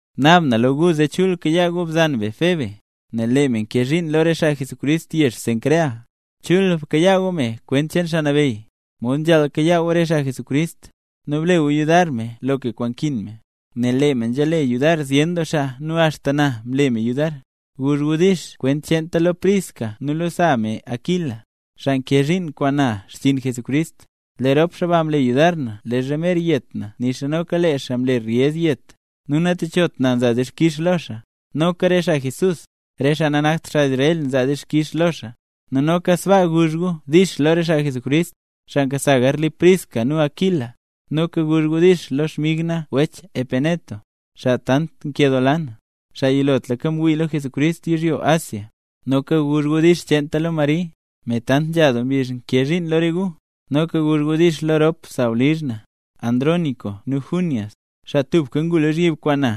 Naab na lo gu zee chul kayaa gu bzan be Febe, nel lee me nkee zhiin lo re xaa Jesucrist yezh Cencrea. Chul bkayaa gu me kwent cheen Xaa Nabeyy, mod nzhaal kayaa gu re xaa mle nambey Jesús. Nu ble gu yudar me loka kwaan nkin me, nel lee me nzhale yudar zyen doo xaa nu axta na mle me yudar. Guzh gu “dix” kwent cheenta lo Priscila nu lo sa me Aquila, xaa nkee zhiin kwaan na lo xchiin Jesucrist. Lee rop xaa ba mle yudar na leezha mer yet na nixa noka lee xaa mle ryez yet; nu natechot na nza na dixkix lo xaa, noka re xaa Jesús, re xaa nanakt xaa Israel nzaa dixkix lo xaa. Nu noka sbaa guzh gu “dix” lo re xaa Jesucrist, xaa nkasa garli Priscila nu Aquila. Noka guzh gu “dix” lo xmig na wech Epeneto, xaa tant nkedoola na, xaa yilotlaka mwii lo Jesucrist yizhyo Asia. Noka guzh gu “dix” cheenta lo Mari, me tant nzha doo mbizh nkee zhiin lo re gu. Noka guzh gu “dix” lo rop sawlizh na, wech Andrónico nu wech Junias, xaa tubka ngu lozhyib kwaan na.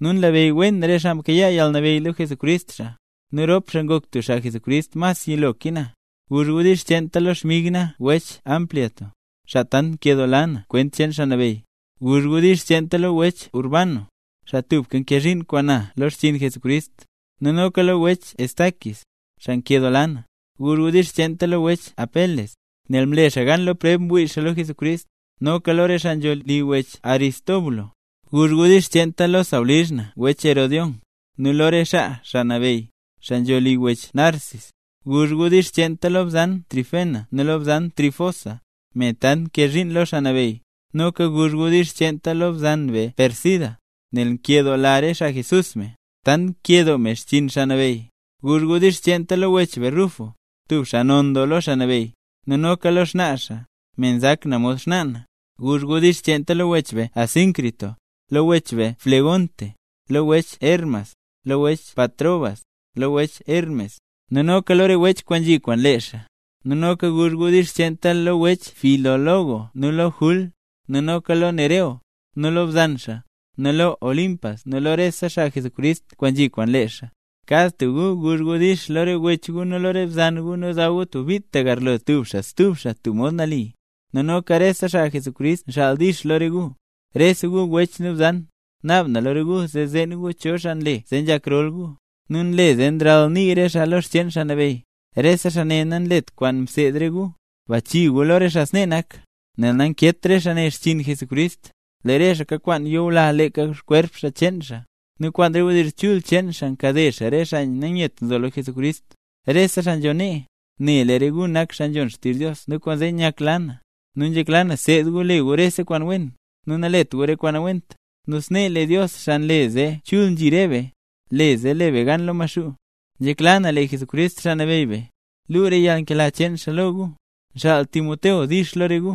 Nu nlabeyy wen re xaa mkayaa yalnabeyy lo Jesucrist xaa, nu rop xaa ngok tub xaa Jesucrist mas yilo ke na. Guzh gu “dix” cheenta lo xmig na wech Ampliato, xaa tant nkedoola na kwent cheen Xaa Nabeyy. Guzh gu “dix” cheenta lo wech Urbano, xaa tubka nkee zhiin kwaan na lo xchiin Jesucrist, nu noka lo wech Estaquis, xaa nkedoola na. Guzh gu “dix” cheenta lo wech Apeles, nel mle xaa gan lo preb ngwii xaa lo Jesucrist; nu noka lo re xaa nzho li wech Aristóbulo. Guzh gu “dix” cheenta lo sawlizh na wech Herodión, nu lo re xaa Xaa Nabeyy, xaa nzho li wech Narcis. Guzh gu “dix” cheenta lo bzan Trifena nu lo bzan Trifosa, me tant nkee zhiin lo Xaa Nabeyy. Noka guzh gu “dix” cheenta lo bzan be Pérsida, nel nkedoola re xaa Jesús me, tant kakee doo me xchiin Xaa Nabeyy. Guzh gu “dix” cheenta lo wech Rufo, tub xaa non doo lo Xaa Nabeyy; nu noka lo xnaa xaa, me nzak na mod xnaa na. Guzh gu “dix” cheenta lo wech Asíncrito, lo wech Flegonte, lo wech Hermas, lo wech Patrobas, lo wech Hermes, nu noka lo re wech kwaan nzhi kwaan lee xaa. Nu noka guzh gu “dix” cheenta lo wech Filólogo nu lo bzan Jul, nu noka lo Nereo, nu lo bzan xaa, nu lo Olimpas nu lo rese xaa mle nambey Jesús kwaan nzhi kwaan lee xaa. Kad tub gu guzh “dix” lo re wech gu nu lo re bzan gu nu daw gu tub bit tagarlo tub xaa stub xaa tub mod nali. Nu noka rese xaa mle nambey Jesús nxaal “dix” lo re gu. Rese gu wech nu bzan, naab na lo re gu zee zeen gu cho xaa nle zee nzhak rol gu, nu nle zee nralnii re xaa lo xcheen Xaa Nabeyy. Re xaa ne nanlet re kwaan mseed re gu. Bachii gu lo re xaa snee nak, nel nankeet re xaa ne xchiin Jesucrist, lee re xaa kakwaan kwaan nyula leeka kwerp cheen xaa; nu kwaan re wdizh chul cheen xaa nkade xaa re xaa nanyet nzo lo Jesucrist. Rese xaa nzho nee, ne lee re gu nak xaa nzhon xtizh Dios nu kwaanzee nyakla na; nu nzhekla na seed gu le gu rese kwaan wen, nu nalet gu re kwaan nawent. Nu snee lee Dios, xaa nle zee chul nzhi re be, le zee le be gan lo Maxuu. Nzhekla na lee Jesucrist, Xaa Nabeyy be, luu re yalnkela cheen xaa lo gu. Nxaal Timoteo “dix” lo re gu,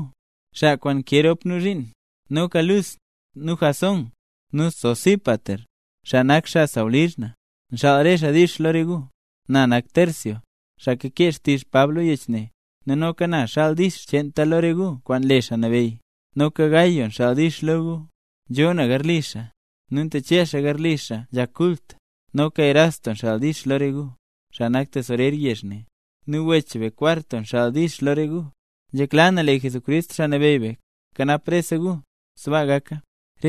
xaa kwaan nkee rop nu zhiin. Noka Lus, nu Jasón, nu Sosípater, xaa nak xaa sawlizh na, nxaal re xaa “dix” lo re gu. Na nak Tercio, xaa kakee xtizh Pab lo yech ne, nu noka na xaal na “dix” cheenta lo re gu kwaan le Xaa Nabeyy. Noka wech Gayo nxaal “dix” lo gu. Nzhoo na garli xaa, nu ntache xaa garli xaa nzhak kult. Noka wech Erasto nxaal “dix” lo re gu, xaa nak tesorer yezh ne, nu wech be Cuarto nxaal “dix” lo re gu. Nzhekla na lee Jesucrist, Xaa Nabeyy be, kanap rese gu. Sbaa gaka.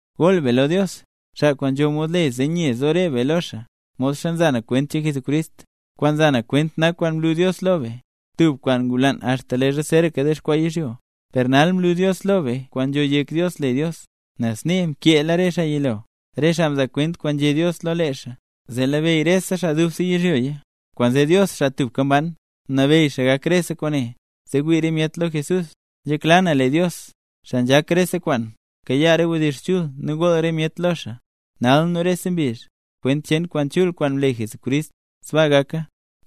Gool be lo Dios, xaa kwaan nzho mod le zee nye zo re be lo xaa, modxa nza na kwent cheen Jesucrist. Kwaan nza na kwent nak kwaan mlu Dios lo be, tub kwaan ngulaan axta leezha zeeraka dexkwaa yizhyo. Per nal mlu Dios lo be kwaan nzho yek Dios le Dios, nel snee mkeela re xaa yilo, re xaa mzaa kwent kwaan nzhé Dios lo lee xaa, zee labeyy rese xaa dubse yizhyoya. Kwaanzee Dios, xaa tubka mban, mnabeyy gak rese kwaane, zee wii re myet lo Jesús. ¡Nzhekla na lee Dios, xaa nzhak rese kwaan, kayaa re wdizh chul nu gool re myet lo xaa, nal nu rese mbizh, kwent cheen kwaan chul kwaan mle Jesucrist! ¡Sbaa gaka!